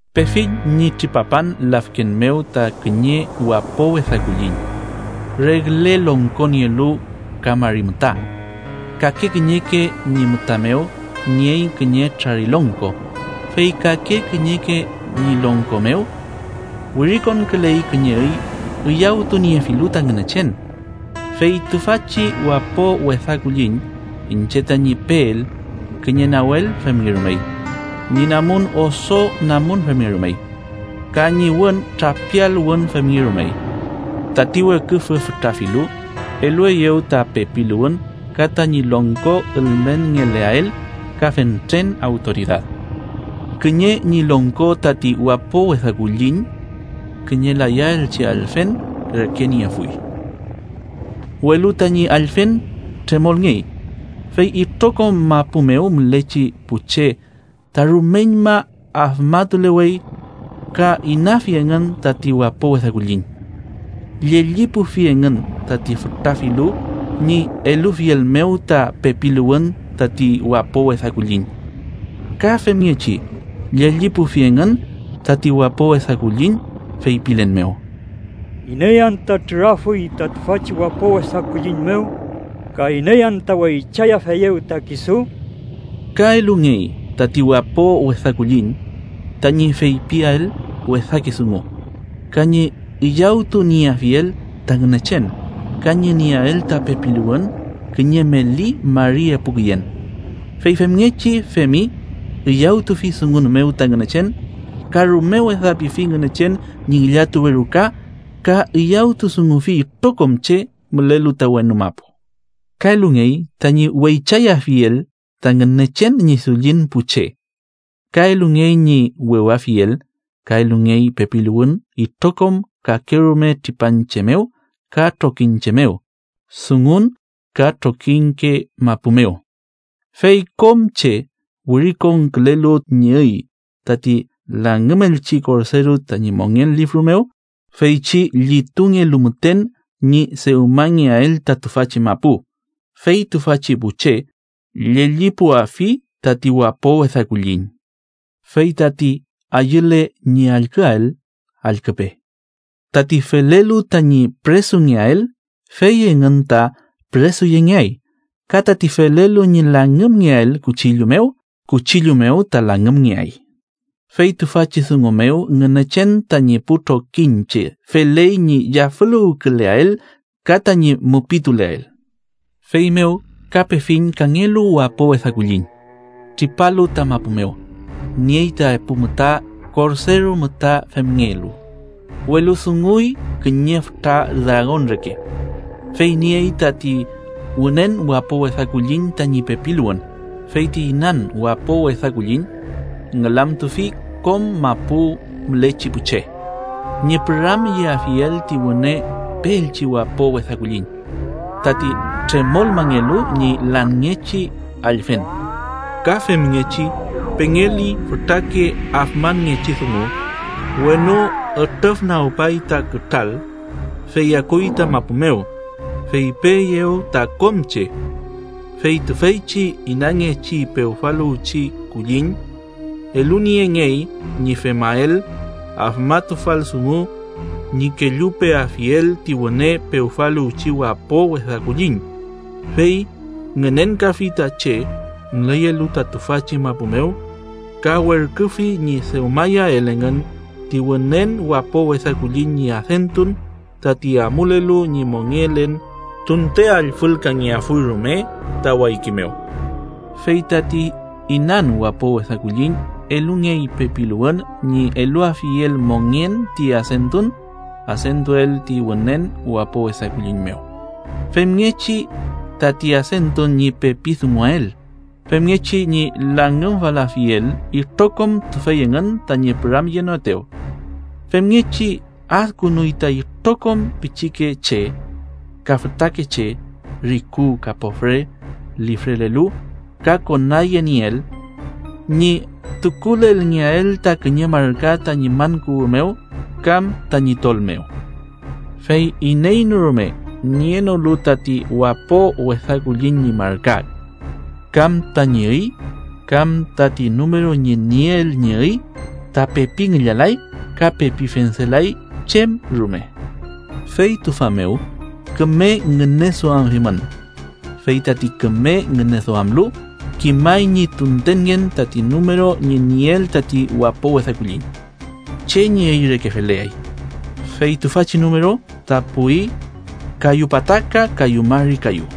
Pefiñ ñi tripapan lafken mew ta kiñe wapo wesa kulliñ regle longko nielu ka mari müta. Kake kiñeke ñi müta mew niey kiñe trarilongko, fey kake kiñeke ñi longko mew wirikonküley kiñe üy üyawtuniefilu ta Ngünechen. Fey tüfachi wapo wesa kulliñ iñche tañi peel, kiñe nawel femngerumey. Ñi namun oso namun femngerumey, ka ñi wün trapial wün femngerumey. Tati weküfü fütra filu elueyew ta pepiluwün ka tañi longko ülmenngeleael, ka fentren awtoridad. Kiñe ñi longko tati wapo wesa kulliñ kiñe layaelchi allfen reke niefuy, welu tañi allfen tremolngey. Fey itrokom mapu mew mülechi pu che ta rumeñma afmatulewey ka inafi engün tati wapo wesa kulliñ. Llellipufi engün tati fütra filu ñi elufiel mew ta pepiluwün tati wapo wesa kulliñ. Ka femngechi llellipufi engün tati wapo wesa kulliñ, feypilen mew: “¿Iney anta trürafuy ta tüfachi wapo wesa kulliñ mew?” ka “¿Iney anta weychayafeyew ta kisu?” Ka elungey tati wapo wesa kulliñ tañi feypiael wesake dungu ka ñi üyawtunieafiel ta Ngünechen, ka ñi nieael ta pepiluwün kiñe meli mari epu küyen. Fey femngechi femi. Üyawtufi dungun mew ta Ngünechen, ka rume wesapifi Ngünechen ñi ngillatuwe ruka ka üyawtudungufi itrokom che mülelu ta wenu mapu. Ka elungey tañi weychayafiel ta Ngünechen ñi dullin pu che, ka elungey ñi wewafiel. Ka elungey pepiluwün itrokom kakerume tripanche mew ka trokiñche mew, dungun ka trokiñke mapu mew. Fey kom che wirikonkülenolu ñi üy tati langümelchi Korderu tañi mongen lifru mew, feychi llitungelu müten ñi dewmangeael ta tüfachi mapu, fey tüfachi pu che llellipuafi tati wapo wesa kulliñ. Fey tati ayüle ñi allküael, allküpe: Tati felelu tañi püresungeael, fey engün ta püresuyengeay; ka tati felelu ñi langümngeael kuchillu mew, kuchillu mew ta langümngeay. Fey tüfachi dungu mew Ngünechen tañi pu trokiñche feley ñi yafüluwküleael ka tañi mupiltuleael. Feymew ka pefiñ kangelu wapo wesa kulliñ, tripalu ta mapu mew. Niey ta epu müta korderu müta femngelu, welu dunguy kiñe fütra dragon reke. Fey niey tati wünen wapo wesa kulliñ tañi pepiluwün, fey ti inan wapo wesa kulliñ ngülamtufi kom mapu mülechi pu che ñi püramyeafiel ti wüne peelchi wapo wesa kulliñ, tati tremolmangelu ñi lanngechi allfen. Ka femngechi pengeli fütrake afmanngechi dungu. Wenu ütrüfnagümpay ta kütral, fey akuy ta mapu mew, fey peeyew ta kom che. Fey tüfeychi inanngechi pewfaluwchi kulliñ eluniengey ñi femael afmatufal dungu ñi kellupeafiel ti wüne pewfaluwchi wapo wesa kulliñ, fey ngünenkafi ta che müleyelu ta tüfachi mapu mew ka werküfi ñi dewmayael engün ti wünen wapo wesa kulliñ ñi adentun tati amulelu ñi mongelen tunte allfülkangefuy rume ta wayki mew. Fey tati inan wapo wesa kulliñ elungey pepiluwün ñi eluafiel mongen ti adentun adentuel ti wünen wapo wesa kulliñ mew, femngechi tati adentun ñi pepi dunguael, femngechi ñi langümfalafiel itrokom tüfey engün tañi püramyenoetew. Femngechi adkünuy ta itrokom pichikeche ka fütakeche, riku ka pofre, lifrelelu ka konayenieel, ñi tukulelngeael ta kiñe marka tañi man kuwü mew kam tañi tol mew. Fey iney no rume nienolu tati wapo wesa kulliñ ñi marka, kam tañi üy, kam tati numeru ñi nieel ñi üy ta pepi ngillalay ka pepi fendelay chem rume. Fey tüfa mew küme ngüneduamafimün. Fey tati küme ngüneduamlu, kimay ñi tuntenngen tati numeru ñi nieel tati wapo wesa kulliñ, che ñi üy reke feleay. Fey tüfachi numeru ta puwi kayu pataka kayu mari kayu.